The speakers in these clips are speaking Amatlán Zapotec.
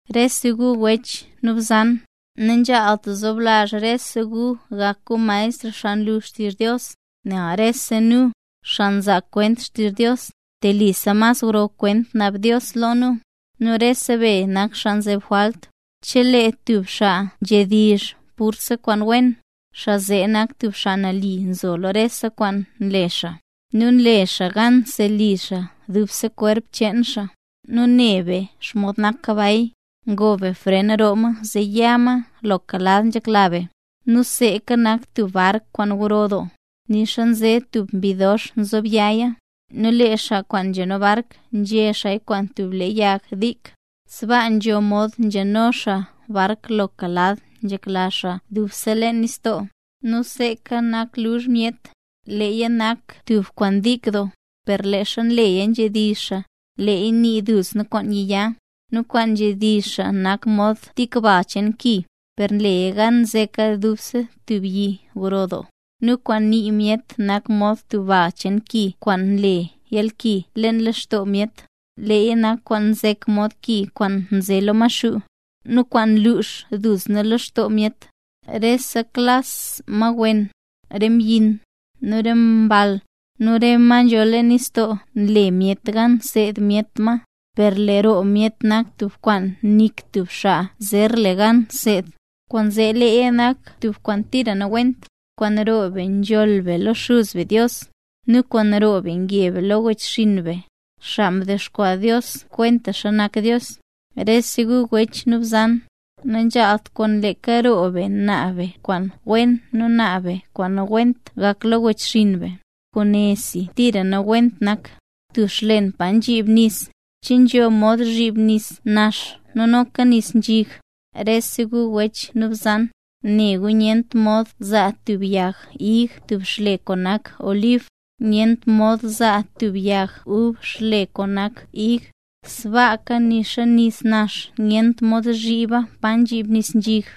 Rese gu wech nu bzan. Nanzhaalt zoblazh rese gu gak gu maestr xaa nlu xtizh Dios; nel rese nu, xaa nzaa kwent xtizh Dios, telisa mas gro kwent naab Dios lo nu. Nu rese be nak xaa nzeb jwalt. Chelee tub xaa nzhedizh purse kwaan wen, xaa zee nak tub xaa nali nzo lo rese kwaan nle xaa, nu nle xaa gan nseli xaa dubse kwerp cheen xaa. Nu ne be xomod nak kabay; ngoo be fren roo ma zee ya ma loka lad nzhekla be. Nu seeka nak tub bark kwaan gro doo, nixa nze tub mbi dox nzobyaya, nu lee xaa kwaan nzhano bark nzhe xaaya kwaan tub le yag dik. Sbaa nzho mod nzhano xaa bark loka lad nzhekla xaa dubse leen nistoo. Nu seeka nak luzh myet; leeya nak tub kwaan tik doo, per leezha leeya nzhedizh xaa, leeya nii duzna kwaan yiya. Nu kwaan nzhedizh xaa nak mod tik bal cheen ki, per nleya gan nzeka dubse tub yi gro doo. Nu kwaan nii myet nak mod tub bal cheen ki kwaan nle yalki leen lextoo myet. Leeya nak kwaan nzek mod ki kwaan nze lo Maxuu, nu kwaan nlux dub lextoo myet. Reta klas ma wen, re mbyin, nu re mball, nu re ma nzho leen nistoo nle myet gan nseed myet ma. Per lee roo myet nak tub kwaan nik tub xaa zer le gan seed. Kwaanzee leeya nak tub kwaan tira nawent. Kwaan roo be nzholl be lo Xuz be Dios, nu kwaan roo be nge be lo re wechxinn be, xaa mdexkwaa Dios kwentaxa nak Dios. Rese gu wech nu bzan, nanzhaalt kwaan leeka roo be naab be kwaan wen nu naab be kwaan nawent gak lo wechxinn be. Kwaane si tira nawent nak. Tub xlen pa nzhib nis, ¿che nzho mod zhib nis nax nu noka nis nzhig? Rese gu wech nu bzan, ne gu nyent mod zaa tub yag ig tub xle kwaan nak olib; nu nyent mod zaa tub yag ub tub xle kwaan nak ig, sbaaka nixa nis nax nyent mod zhiba pa nzhib nis nzhig.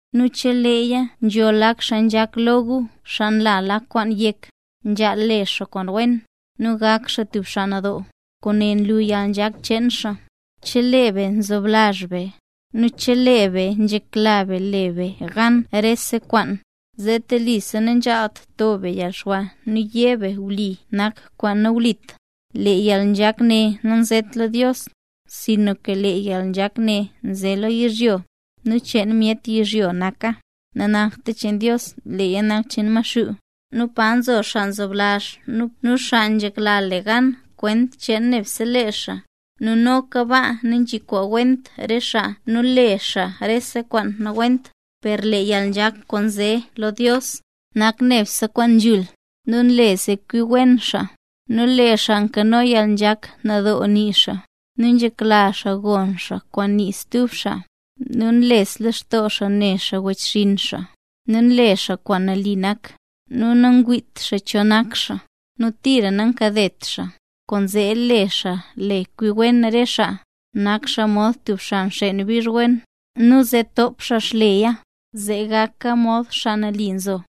Nu chelee nzho lak xaa nzhak lo gu nla lak kwaan yek, nzhaal le xaa kwaan wen, nu gak xaa tub xaa nadoo, kwaane lu yalnzhak cheen xaa. Per chelee be nzoblazh be, nu chelee be nzhekla be le be gan rese kwaan, zee telisa nanzhaalt to be yalxwa nu yé be wli nak kwaan nawlit. Lee yalnzhak ne nanzet lo Dios, sinka lee yalnzhak ne nze naz lo yizhyo, nu cheen myet yizhyo naka; nanakta cheen Dios leeya nak cheen Maxuu. Nu pa nzo xaa nzoblazh nu xaa nzhekla le gan kwent cheen nebse lee xaa, nu noka baa nanzhiwent re xaa nu le xaa rese kwaan nawent. Per lee yalnzhak kwaan nze lo Dios nak nebse kwaan nzhul, nu nle zee kwi wen xaa; nu lee xaa nkano yalnzhak: nadoo nii xaa, nu nzhekla xaa gon kwaan nii stub xaa, nu nles lextoo xaa ne xaa wechxinn xaa, nu nle xaa kwaan nali nak, nu nangwiit xaa cho nak xaa, nu tira nankadet xaa. Kwaanzee lee xaa le kwi wen re xaa, nak xaa mod tub xaa nxeen bizh wen, nu zee top xaa xleya, zee gaka mod xaa nali nzo.